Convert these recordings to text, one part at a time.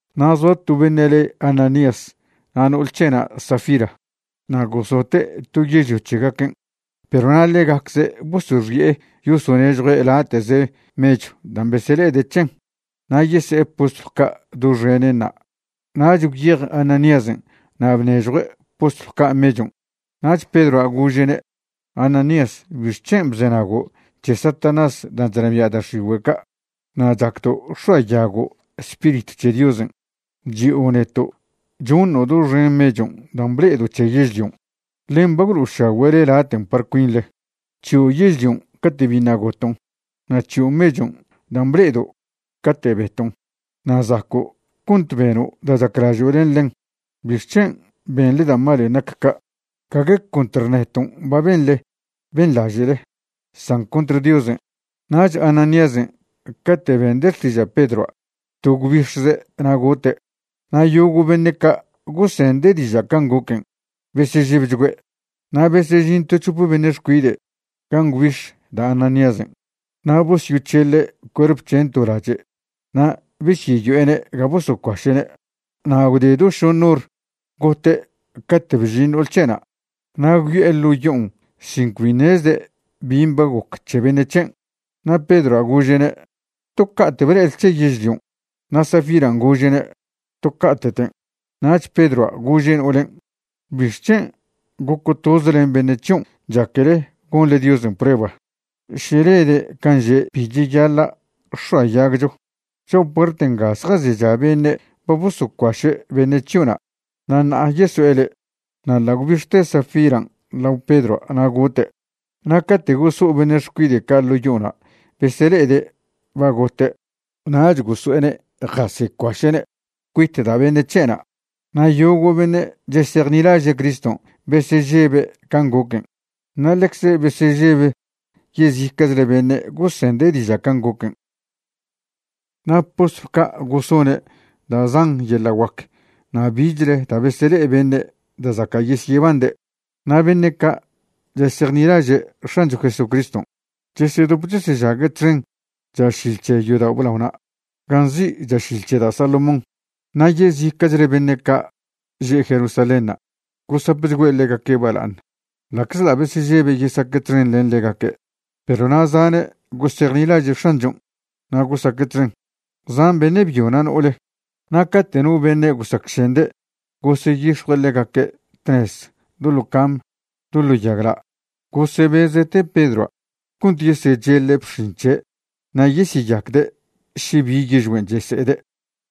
Na' zoa to beṉe' le Ananías na' no'ol c̱he'na' Safira, na' gosote' to yežlio c̱hegaquen'. Perw na' ḻegacze' bosoxi'e yosonežjue' late'ze mechw dan' besele'ede' c̱hen na' yese'e postlw ca' doxenenṉa'. Nach gwyej Ananíasen' na' bnežjue' postlw ca' mechon'. Nach Pedroa' gože'ne': ―Ananías, ¿bixc̱hen' bzenago' c̱he Satanás dan' chnabia' da' x̱igüe' ca' na' chacdo' x̱oayago' Spiritw c̱he Diosen'? Chi'o neto' choṉo' doxen mechon' dan' ble'edo' c̱he yežlion', ḻen ba gwlo'ošagüe'le laten' par cuinḻe. C̱hio' yežlion' cate' biṉa' goton', na' c̱hio' mechon' dan' ble'edo' cate' beton' na' zaco' cont beno' da' chaclažo' len ḻen. ¿Bixc̱hen' benḻe da' malen' nac ca'? Gague contr neton' ba benḻe benḻaže'le, san contr Diosen'. Nach Ananíasen' cate' bende' xtiža' Pedroa' to gwbix̱ze' na' gote'. Na' yogo' beṉe' ca' gosende' diža' can' goquen' besežebchgüe'. Na' besežin to c̱hope beṉe' xcuide' gan' gwbix̱ da' Ananíasen' na' bosyoc̱heḻe' cuerp c̱hen' to lache' na' besyeyo'ene' ga bosocuaše'ne'. Na' gwde do šoṉ hor gote' cate' bžin no'ol c̱he'na' na' gwyo'e ḻo' yo'on sin cbi ṉezde' bin' ba goc c̱he beṉe' c̱hen'. Na' Pedroa' gože'ne': ―¿To ca'te' ble'ele c̱he yežlion'? Na' Safiran' gože'ne': ―To ca'te'ten'. Nach Pedroa' gože' no'olen': ―¿Bixc̱hen' goco' toze len beṉe' c̱hion' chaquele gonḻe Diosen' prueba še lede' can' že' bi cheyaḻa' x̱oayagcho? Cho'a puert nga zjazecha beṉe' ba bosocuaše' beṉe' c̱hio'na' na' ṉa'a yeso'e le'. Na' ḻa' gwbix̱te Safiran' lao Pedroa' na' gote'. Na' cate' goso'o beṉe' xcuide' ca' ḻo' yo'ona' besele'ede' ba gote' nach goso'ene' jasecuaše'ne' cuit da' beṉe' c̱he'na'. Na' yogo' beṉe' chesejnilaže' Criston' besežebe' can' goquen' na' ḻecze besežeb yezica'chle beṉe' gosende' diža' can' goquen'. Na' postlw ca' gosone' da' zan yeḻa' guac na' bichle da' besele'e beṉe' da' zaca' yesyebande'. Na' beṉe' ca' chesejnilaže' X̱ancho Jesucriston' chesedop chesežague' txen chašil c̱he yodao' blaona' gan' nzi' Chašil c̱he da' Salomón. Na' yezica'chle beṉe' ca' že' Jerusalénṉa' gosapchgüe' ḻegaque' bala'aṉ, ḻa'czḻa' besežebe' yesaque' txen len ḻegaque'. Perw na' zane' gosejnilaže' X̱anchon' na' gosaque' txen, zan beṉe' byo na' no'ole. Na' cate' no beṉe' gosacšende' goseyix̱jue' ḻegaque' tnez do ḻo cam do ḻo yagla', gosebeze' te Pedroa' cont yesecheḻe' bx̱in c̱he' na' yesyeyacde' še bi yižgüen' chese'ede'.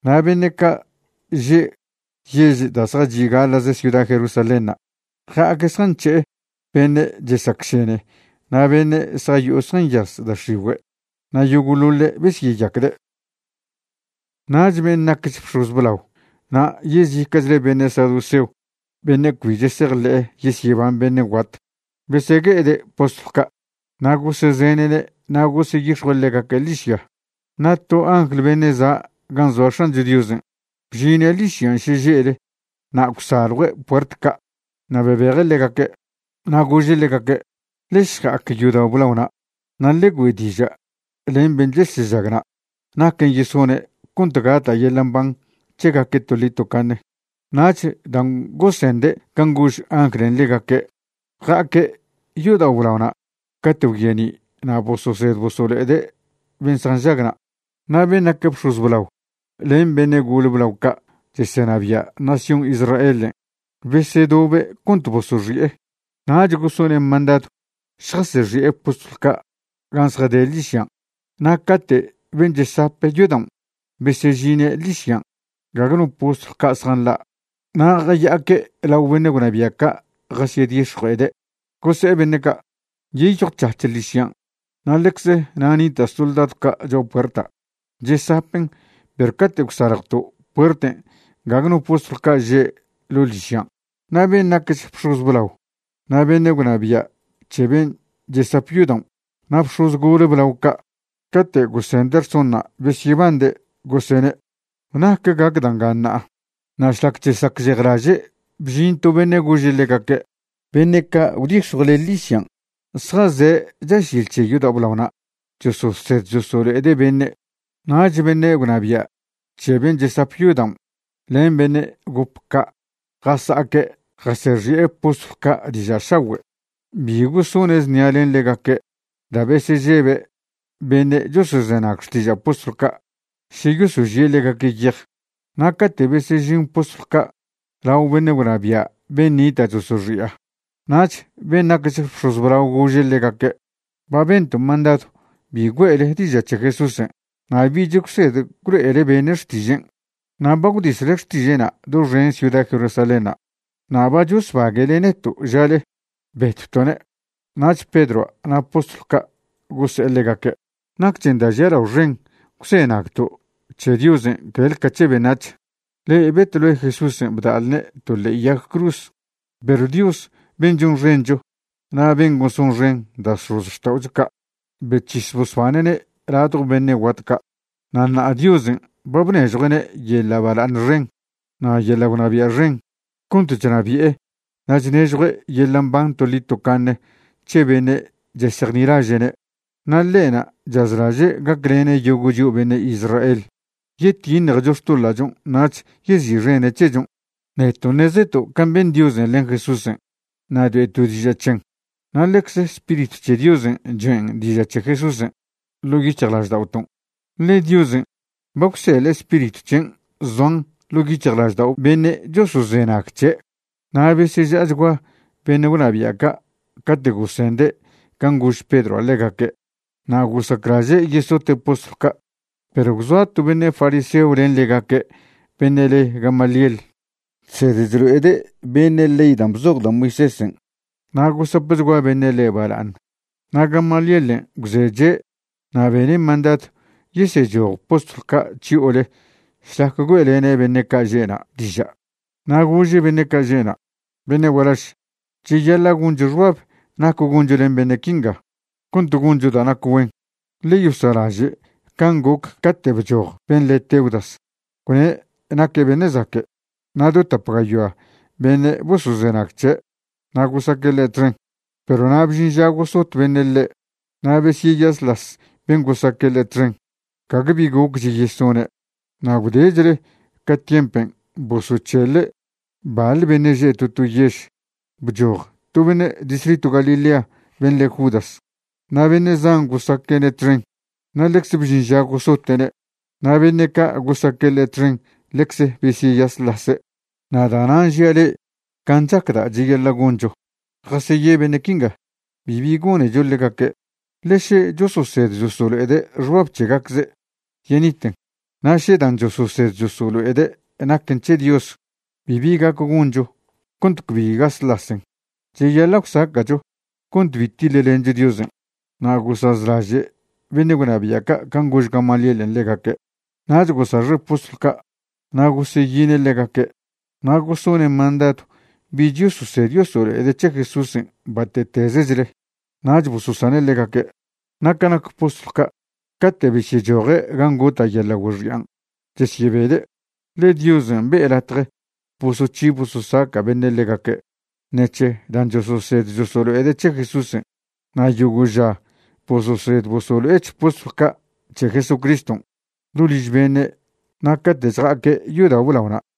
Na' beṉe' ca' že' yež da' zjachi' gaḻa'ze ciuda Jerusalénṉa' ja'aque' zjanc̱he'e beṉe' chesacšene na' beṉe' zjayo'o zjanyaz da' x̱igüe'. Na' yogo'ḻoḻe' besyeyacde'. Nach ben' nacch bx̱oz blao na' yezica'chle beṉe' saduceo beṉe' cbi chesejḻe' yesyeban beṉe' guat, besegue'ede' postlw ca'. Na' gosezene'ne' na' goseyix̱jue' ḻegaque' ḻižya. Na' to angl beṉe' za' gan' zoa X̱ancho Diosen' bžine' ḻižyan' šeže'le na' gwsaljue' puert ca' na' bebeje' ḻegaque'. Na' gože' ḻegaque': ―Ḻe šja'ac yodao' blaona' na' ḻe güe' diža' len ben' chesežagna' naquen' yesone' cont gata' yeḻa' mban c̱hegaque' toḻi tocaṉe. Nach dan' gosende' can' gož anglen' ḻegaque', ja'aque' yodao' blaona' cate' gwyeni' na' bososed bosolo'ede' ben' zjanžag na'. Na' ben' nac bx̱oz blao len beṉe' gole blao ca' chesenabia' nación Israelen' besedobe' cont bosoxi'e, nach gosone' mandadw šjasexi'e postlw ca' gan' zjade' ḻižyan'. Na' cate' ben' chesap yodaon' besežine' ḻižyan' gague no postlw ca' zjanḻa' na' jaya'aque' lao beṉe' gwnabia' ca' jasyedix̱jue'ede'. Gose'e beṉe' ca': ―Nyeyjwc̱hac̱h ḻižyan' na' ḻecze na' nita' soldadw ca' cho'a puerta' chesapen' perw cate' gwsaljwto' puerten' gague no postlw ca' že' ḻo' ḻižyan'. Na' ben' nacch bx̱oz blao na' beṉe' gwnabia' c̱he ben' chesap yodaon' na' bx̱oz gole blao ca' cate' gosende' rsonṉa' besyebande', gosene': ―¿Nac gac da' nga ṉa'a? Na' šlac chesacžejlaže', bžin to beṉe' gože' ḻegaque': ―Beṉe' ca' gwdix̱jwle ḻižyan' zjaze' chašil c̱he yodao' blaona' chososed chosolo'ede' beṉe'. Nach beṉe' gwnabia' c̱he ben' chesap yodaon' len beṉe' gop ca' jasa'aque' jasexi'e postlw ca' diža' šagüe'. Bi gosone' znia len ḻegaque' da' besežebe' beṉe' chosozenag xtiža' postlw ca' še yosožie' ḻegaque' yej. Na' cate' besežin postlw ca' lao beṉe' gwnabia' ben' nita' chosoxi'a, nach ben' nacch bx̱oz blao gože' ḻegaque': ―Ba bento' mandadw bi güe'le diža' c̱he Jesúsen' na' bich gwsed gwlo'ele beṉe' xtižen', na' ba gwdisle xtiže'na' doxen ciuda Jerusalénṉa'. Na' ba chosbague'le neto' žale betwto'ne'. Nach Pedroa' na' postlw ca' gose'e ḻegaque': ―Nacchen da' žialao xen gwzenagto' c̱he Diosen' clel ca c̱he beṉac̱h. Le'e betwle Jesúsen' bda'lne' to ḻe'e yag cruz, perw Dios ben' chonxencho na' ben' gosonxen da' x̱ozxta'ocho ca' bec̱his bosbane'ne' ladjo beṉe' guat ca'. Na' ṉa'a Diosen' ba bnežjue'ne' yeḻa' bala'aṉ xen na' yeḻa' gwnabia' xen cont chnabi'e na' chnežjue' yeḻa' mban toḻi tocaṉe c̱he beṉe' chesejnilaže'ne'. Na' ḻe'na' chazlaže' gaclene' yogo' chio' beṉe' Israel yetiṉjecho xtoḻa'chon' nach yezi'xene' c̱hechon'. Neto' ṉezeto' can' ben Diosen' len Jesúsen' na' choe'to' diža' c̱hen, na' ḻecze Spiritw c̱he Diosen' choen' diža' c̱he Jesúsen' ḻo' yic̱hjlažda'oton', ḻe Diosen' ba gwseḻe' Spiritw c̱hen' zoan ḻo' yic̱hjlaždao' beṉe' chosozenag c̱he'. Na' beseža'achgua beṉe' gwnabia' ca' cate' gosende' can' gož Pedroa' ḻegaque' na' gosaclaže' yesote' postlw ca'. Perw gwzoa to beṉe' fariseo len ḻegaque' beṉe' le Gamaliel. Chsed chlo'ede' beṉe' ley dan' bzoj da' Moisésen' na' gosapchgua beṉe' ḻe' bala'aṉ. Na' Gamalielen' gwzeche' na' bene' mandadw yesechoj postlw ca' chyo'ole šlac güe'lene' beṉe' ca' že'na' diža'. Na' gože' beṉe' ca' že'na': ―Beṉe' gualaž, cheyaḻa' goncho xbab nac goncho len beṉe' quinga cont goncho da' nac güen. Ḻe yosa'laže' can' goc cate' bchoj ben' le Teudas gwne' naque' beṉe' zaque'. Na' do tap gayoa beṉe' bosozenag c̱he' na' gosaque' ḻe' txen. Perw na' bžin ža gosot beṉe' ḻe' na' besyeyasḻas ben' gosaque' ḻe' txen, gague bi gocch yesone'. Na' gwdechle ca tiempen' bosoc̱heḻe' baḻ beṉe' že' to to yež, bchoj to beṉe' distritw Galilea ben' le Judas na' beṉe' zan gosaque'ne' txen. Na' ḻecze bžin ža gosote'ne' na' beṉe' ca' gosaque' ḻe' txen ḻecze besyeyasḻase'. Na' da'nan' žia' le'e can' chacda' cheyaḻa' goncho, jaseye beṉe' quinga, bibi gonecho ḻegaque'. Ḻe še chososed chosolo'ede' xbab c̱hegacze', yeniten. Na' še dan' chososed chosolo'ede' naquen c̱he Dios, bibi gac goncho cont cbi gaslasen. Cheyaḻa' gwsaca'cho cont bi tiḻlencho Diosen'. Na' gosazlaže' beṉe' gwnabia' ca' can' gož Gamalielen' ḻegaque'. Nach gosaxe' postlw ca' na' goseyine' ḻegaque' na' gosone' mandadw bich yososed yosolo'ede' c̱he Jesúsen' bate'tezechle. Nach bososane' ḻegaque'. Na' ca nac postlw ca', cate' besyechoje' gan' gota' yeḻa' güexian', chesyebede', ḻe Diosen' be'e latje bosoc̱hi bososaca' beṉe' ḻegaque' ṉec̱he dan' chososed chosolo'ede' c̱he Jesúsen'. Na' yogo' ža bososed bosolo'ech postlw ca' c̱he Jesucriston' do liž beṉe' na' cate' chja'aque' yodao' blaona'.